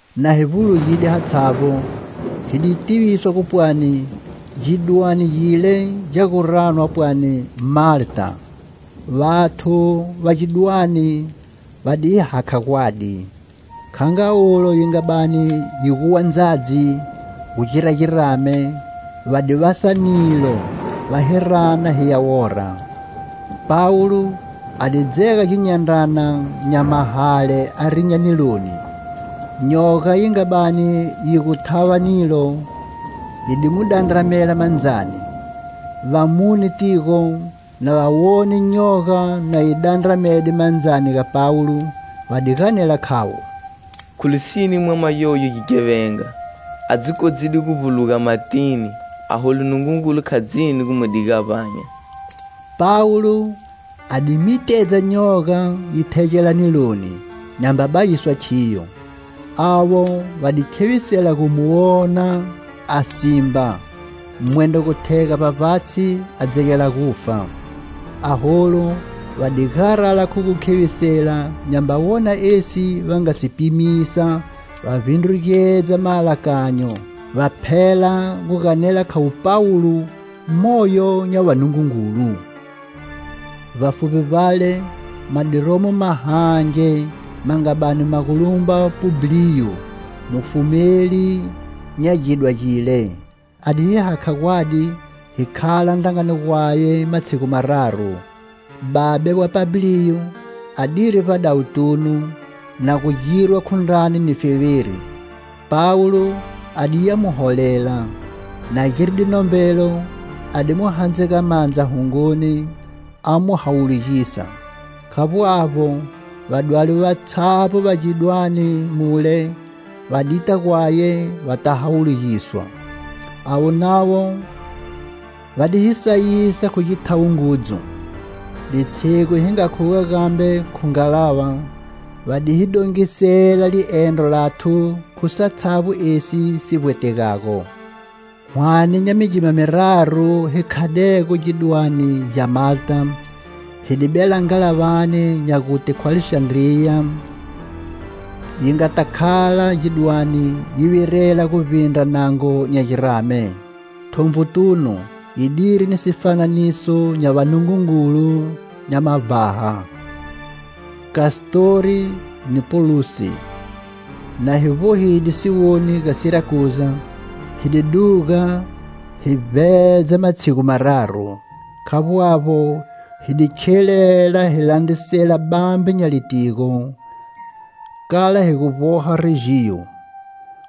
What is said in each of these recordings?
Na hi vbulugide hatshavbo, hi di tiviswa gu pwani gidwane gile gya gu ranwa pwani Malta. Vathu va gidwane va di hi hakha gwadi. Kha nga ulo yi nga bani yi guwa ndzadzi gu gira girame, va di vasa nilo, va hi rana hiya wora. Pawulo a di dzega ginyandrana nya mahale a rinya niloni. Nyoga yi nga bani yi gu thava nilo, hi di mu dandramela mandzani. Vamune tigo, na va wone nyoga na yi dandramede mandzani ga Pawulo, va di ganela khavo: "Khu lisine mwama yoyu gighevenga, a dzi kodzide gu vbuluga matini, aholu Nungungulu kha dzini gu mu diga a vbanya." Pawulo a di mitedza nyoga yi thegela niloni, nyamba bayiswa khiyo. Avo va di khevisela gu mu wona a simba, mwendro gu thega vbavbatshi a dzegela gufa. Aholu va di garala khu gu khevisela nyamba wona esi va nga si pimisa va vbindrugedza maalakanyo, va phela gu ganela khavo Pawulo moyo nya vanungungulu. Vbafuvbi vbale ma di romo mahange ma nga bani ma gu lumba Publiyo, mufumeli nya gidwa gile. A di hi hakha gwadi hi khala ndrangani gwaye matshigu mararu. Babe wa Pabliyo adiri vbadawutunu, na gu girwa khu ndrani ni feveri. Pawulo a diya mu holela. Na giride nombelo, a di mu handzega mandza hungoni, a mu hawulugisa. Khavbo avbo, vadwali vatshavbo va gidwane mule va dita gwaye va ta hawulugiswa. Avo navo va di hi sayisa khu githawo ngudzu. Litshigu hi nga khuga gambe khu ngalava, va di hi dongisela liendro lathu khu satshavbo esi si vbwetegago. Hwane nya migima miraru hi khadego gidwane gya Malta, hi di bela ngalavani nya gute khu Alexandriya yi ngata khala gidwane yi virela guvbindra nango nya girame. Thonvutunu, yidiri ni sifananiso nya vanungungulu nya mavbaha: Kastori ni Poluse. Na hi vbohide siwoni ga Sirakuza, hi di duga hi vbedza matshigu mararu, khavbo avbo, hi di khilela hi landrisela bambe nya litigo, kala hi gu vboha Rejiyo.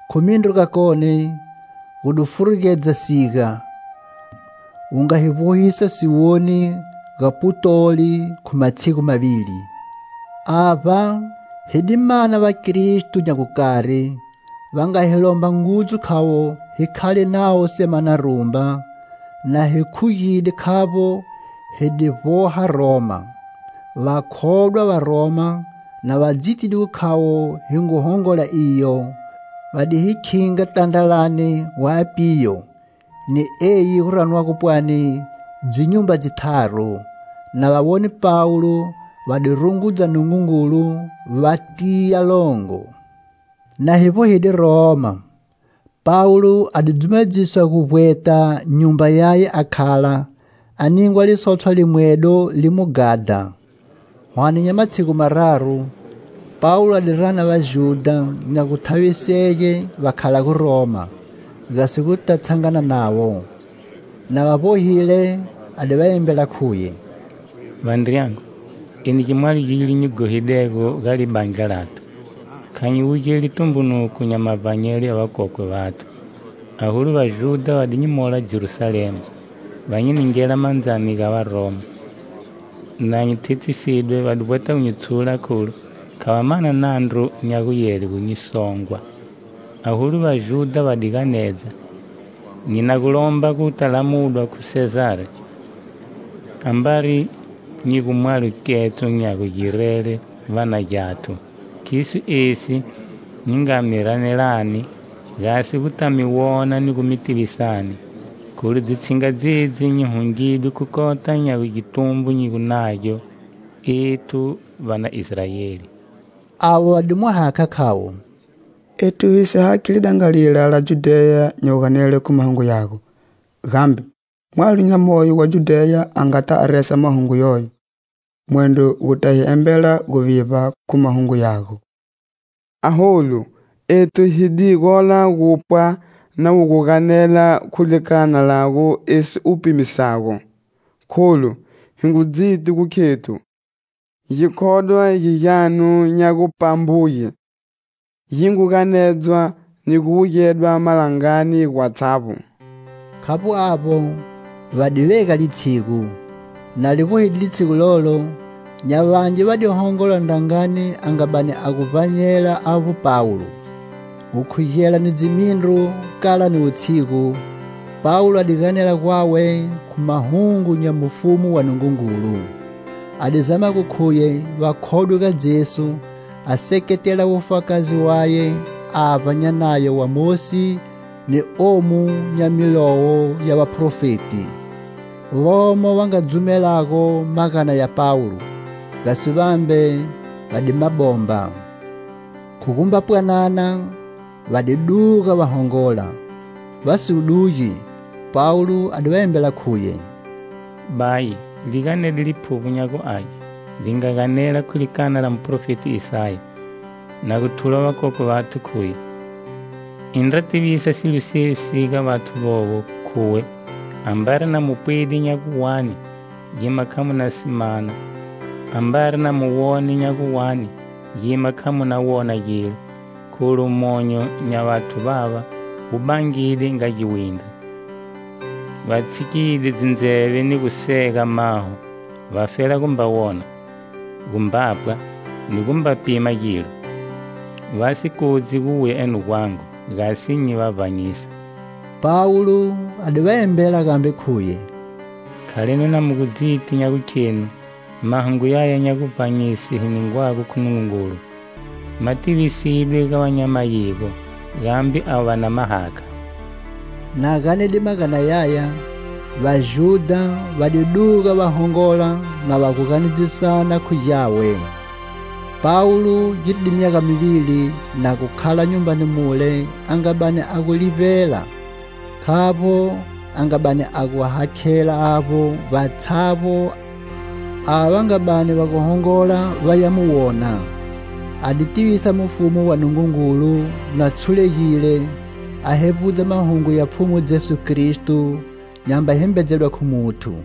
Khu mindru gakone, gu di furugedza siga, wu nga hi vbohisa siwoni ga Putoli khu matshigu mavili. Avba hi di mana vaKristo nya gukari, va nga hi lomba ngudzu khavo hi khale navo semana rumba, na hi khugide khavbo, hi di vboha Roma. Vakhodwa va Roma, na va dzitide gu khavo hi ngu hongola iyo, va di hi khinga tandralani wa Apiyo ni eyi gu ranwago pwani "Dzinyumba Dzitharu." Na va wone Pawulo, va di rungudza Nungungulu, va tiya longo. Na hi vbohide Roma, Pawulo a di dzumedziswa gu vbweta nyumba yaye a khala, a ningwa lisotshwa limwedo li mu ghadha. Hwane nya matshigu mararu, Pawulo a di rana Vajudha nya guthavisege va khalago Roma, gasi guta tshangana navo. Na va vbohile a di va embela khuye: "Vandriyangu, eni gimwalo gilo nyi ghohidego ga libandla lathu, kha nyi wugeli tumbunuko nya mavbanyelo ya vakokwe vathu. Aholu Vajudha va di nyi mola Jerusalema, va nyi ningela mandzani ga Varoma. Na nyi thethisidwe, va di vbweta gu nyi tshula, kholu kha va mana nandru nya guyele gu songwa. Aholu Vajudha va di ganedza, nyi na gu lomba guta lamudwa khu Sezari, ambari nyi gu mwalo ketso nya gugirele va na gyathu. Khiso esi nyi nga mi ranelani, gasi gu ta mi wona ni gu mi tivisani, kholu dzitshinga dzedzi nyi hungidwe khu kota nya gitumbo hi gu nagyo ethu va na Israeli." Avo va di mu hakha khavo: "Ethu hi si hakhi lidangalila la Judheya nya guganele khu mahungu yago. Gambe mwalo na moyo wa Judheya a ngata a resa mahungu yoyo, mwendro gu ta hi embela guvivba khu mahungu yago. Aholu ethu hi di gola gu gupwa na wu gu ganela khu likana lago esi u pimisago, kholu hi ngu dziti gu khethu, gikhodwa gi gyanu nya gu pambuge, gi ngu ganedzwa ni gu wugedwa malangani gwatshavbo." Khavbo avbo, va di vega litshigu. Na li vbohide litshigu lolo, nya vangi va di hongola ndrangani a nga bani a gu vbanyela avbo Pawulo. Gukhugela ni dzimindru kala ni wutshigu, Pawulo a di ganela gwawe khu mahungu nya Mufumu wa Nungungulu. A di zama gu khuye va khodwe ga Jesu, a seketela wufakazi waye avba nya Nayo wa Mosi, ni omu nya milowo ya vaprofeti. Vomo va nga dzumelago magana ya Pawulo, gasi vambe va di ma bomba. Khu gumba pwanana, va di duga va hongola. Va si gu dugi, Pawulo a di va embela khuye: "Bayi, li ganede Liphuvbo nya gu Age, li nga ganela khu likana la muprofeti Isaya, na gu thula vakokwe vanu khuye: 'Indra tivisa silo sesi ga vathu vovo, khuwe: Ambari na mu pwide nya gu wani,gima kha mu na si mana,Ambari na mu wonide nya gu wani,gima kha mu na wona gilo Kholu monyo nya vathu vava wu bangide nga giwindri Va tshikide dzindzeve ni gu sega maho,vafela gumba wona, gu mbapwa ni gumba pima gilo,va si kodzi guwuya eno gwangu gasi nyi va vbanyisa.' " Pawulo a di va embela gambe khuye: "Khalani na mu gu dziti nya gukhenu Mahungu yaya nya guvbanyise hi ningwago khu Nungungulu ma tivisidwe ga va nya mayigo, gambe avo va na ma hakha." [ Na ganede magana yaya, Vajudha va di duga va hongola na va gu ganedzisana khu gyawe.] Pawulo giride myaga mivili na gu khala nyumbani mule a nga bani a gu livbela, khavbo a nga bani a gu hakhela avbo vatshavbo ava va nga bani va gu hongola vaya mu wona. A di tivisa Mufumu wa Nungungulu na tshulegile, a hevbudza mahungu ya Pfhumu Jesu Kristo, nyamba himbedzedwa khu muthu.